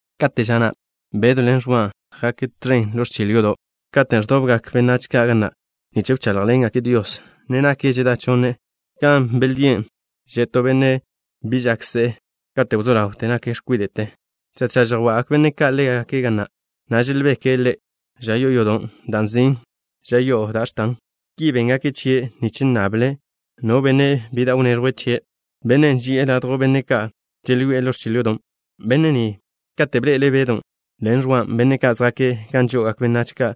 Kate' ža na' Bedw ḻen Ẕwa jake' tẕen ḻo ẕchil yodo', katen' ẕdobgak benách ka' ga na', nich wcháḻjḻengake' Dios, ne naken žedá chonne. Gan želdíe' zoa to benne' bi žak se'e kate' wzó ḻaw ža ni'te katen' nake' x̱kwide'. Tža tža žjwa'gak benne' ka' ḻe' ga na', na' želbeke' ḻe' žoa'a yodo' gan nzin' Da' X̱tan Gan Žo'ožo. Ki béngake' chie' nich nnable' no benne' bi da' wneẕjwe' chie', bennen' zoe' ladjw benne' ka' želyoé'e ḻo ẕchil yodon'. Benne' ni, katen' bḻe'ele' Bedon' ḻen Ẕwan', benne' ka' zjake' gan žo'ogak benách ka'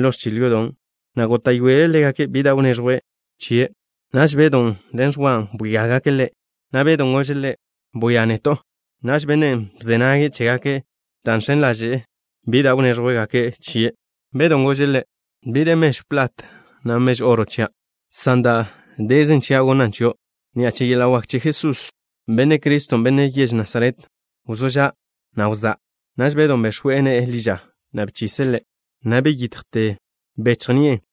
ḻo ẕchil yodon', na' góta'yoele' ḻégake' bi da' wnéẕjwgake' chie'. Naž Bedon' ḻen Ẕwan' bwíagake' ḻe', na' Bedon' gože' ḻe': —Bwia neto'. Naž bennen' bze nage' chégake' dan' žx̱en ḻaže'e bi da' wnéẕjwgake' chie'. Bedon' gože' ḻe': —Bi de mežw plat, na' mežw oro chia', san da' dezen chia' gonna' chio'. Ni'a che yeḻa' wak che la Jesús, Benne' Criston', Benne' yež Nasaret, wzó ža', na' wzá'. Naž Bedon' bex̱we' ne'e ḻi ža, na' bchise' ḻe', na' ḻa' beyakte ni'e, na' beyitjte bechj ni'e.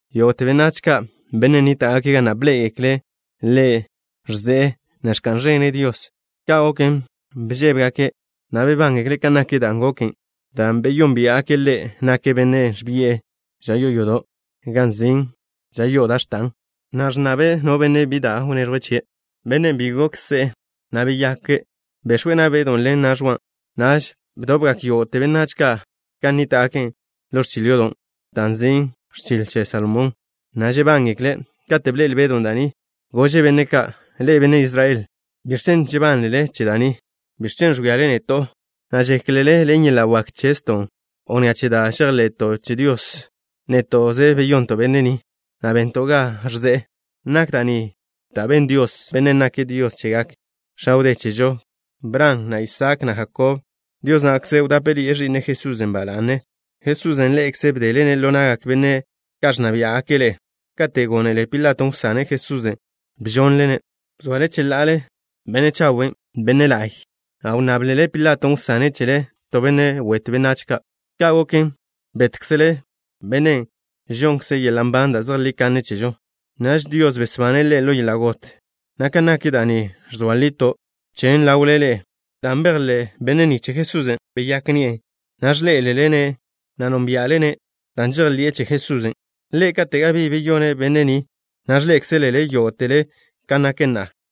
Yógo'te benách ka', benne' nníta'gake' ga na', bḻé'egekle' ḻe' ẕze'e, na' ẕka'n ẕene' Dios. Ka' goken, bžébegake', na' bebángekle' kan nak dan' goken, dan' beyónbia'gake' ḻe', nake' bennen' ẕbi'e žoa'a yodo' gan nzin' Da' X̱tan Gan Žo'ožo, na' ẕnnabe' no benne' bi da' wneẕjwe' chie'. Bennen' bi gok se'e, na' beyake', bex̱we' na' Bedw ḻen na' Ẕwa. Naž bdobgak yógo'te benách ka' gan nníta'gake' ḻo ẕchil yodo' da' nzin' Ẕchil Che Salomón, na' žebángekle'. Kate' bḻe'el Bedon' da' ni, gože' benne' ka': —Ḻe'e, benne' Israel ka', ¿biẕ chen' žebánlele che da' ni? ¿Biẕ chen' ẕwíale neto', na' žéklele ḻen yeḻa' wak chezto', o ni'a che da' žejḻe'to' che Dios, néto'ze beyonto' benne' ni, na' bento' ga ẕze'e? Nak da' ni da' ben Dios, Bennen' nake' Dios chegak x̱a wdé chežo ka', Bran, na' Isaak, na' Jakob. Dios na'kze wdápeḻi'e Ẕi'ne', Jesusen', ba la'ne. Jesusen', ḻe'ekze bdele-ne' ḻo na'gak benne' ka' ẕnna biá'gake' ḻe'e. Kate' gónele Pilato wsane' Jesusen', bžonle-ne'. Bzoale cheḻa'ale Benne' Chawen', Benne' la'y, na' wnnáblele Pilaton' wsane' chele to benne' wetw benách ka'. Ka' goken, bétkzele Bennen' žonnkze' yeḻa' nban da' zejlí kanne chežo. Naž Dios besbane' Ḻe' ḻo yeḻa' got, na' kan nak da' ni ẕzoa lito' chen ḻawle ḻe'e. Dan' bejḻé' benne' ni che Jesusen', beyák ni'e, na' ẕḻé'elele-ne', na' nónbia'le-ne'. Dan' žejḻi'e che Jesusen', Ḻe' kate' gabí beyone' benne' ni, na' ẕḻé'ekzelele yógo'tele kan nake' na'a.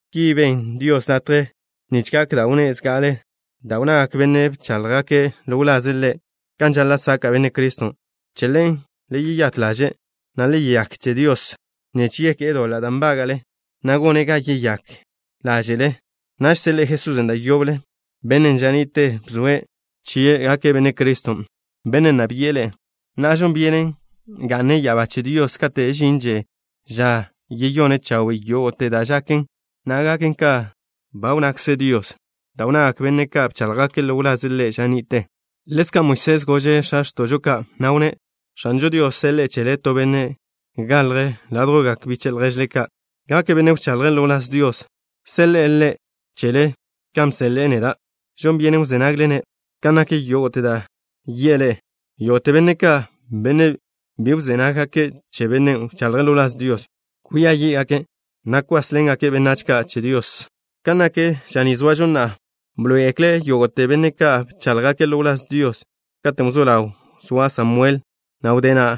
Ki be' Dios latje nich gak da' wnné' zga'ale, da' wnnagak benne' ka' bcháḻjgake' ḻo wlaze' Ḻe' kan žaḻa' saka' Benne' Criston'. Che ḻen, le yeyát ḻaže', na' le yeyák che Dios, nich yeké'e doḻa' da' nbága'le, na' gone' ga yeyák ḻáže'le. Naž seḻe'e Jesusen' da' yoble, Bennen' ža ni'te bzoe' chie' gake' Benne' Criston', Bennen' nna bi'e ḻe'e. Na'a, žon byenen ga'ne' ya'abá che Dios kate' žinže ža yeyone' chawe' yógo'te da' žaken, na' gaken kan ba wnnakze Dios, da' wnnagak benne' ka' bcháḻjgake' ḻo wlaze' Ḻe' ža ni'te. Ḻezka' Moisés gože' x̱a x̱to'žo ka', na' wnné': “X̱anžo Dios seḻe'e chele to benne' galje' ládjwgak biche' lježle ka'. Gake' benne' wchaḻje' ḻo wláz Dios. Seḻe'e Ḻe' chele kan bseḻe'e neda'. Žon byenen wzé nagle-ne' kan nak yógo'te da' yi'e ḻe'e. Yógo'te benne' ka', benne' bi wzé nággake' che Bennen' wchaḻje' ḻo wláz Dios, kwia yí'gake', na' kwásḻengake' benách ka' che Dios.” ’Kan nak ža ni zoažo na'a, bḻoé'egekle yógo'te benne' ka' bcháḻjgake' ḻo wláz Dios kate' wzó ḻaw zoa Samuel, na' wdé na'.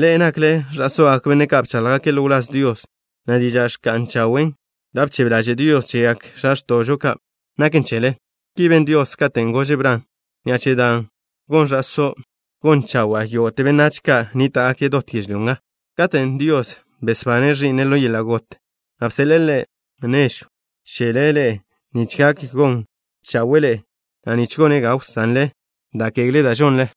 Ḻe'e nakle ẕa'sógak benne' ka' bcháḻjgake' ḻo wláz Dios, na' diža' ẕka'n chawe', da' bchebe ḻaže' Dios chegak x̱a x̱to'žo ka', naken chele. Ki ben Dios katen' gože' Bran: “Ni'a che da' gon ẕa'só' gon chawa'a yógo'te benách ka' nníta'gake' dot yežlyó nga.” Katen' Dios besbane' Ẕi'ne' ḻo yeḻa' got, na' bseḻe'e Ḻe' nežw chele ḻe'e nich gak gon chawe'e ḻe'e, na' nich gone' ga wsanle da' kegle da' žonle.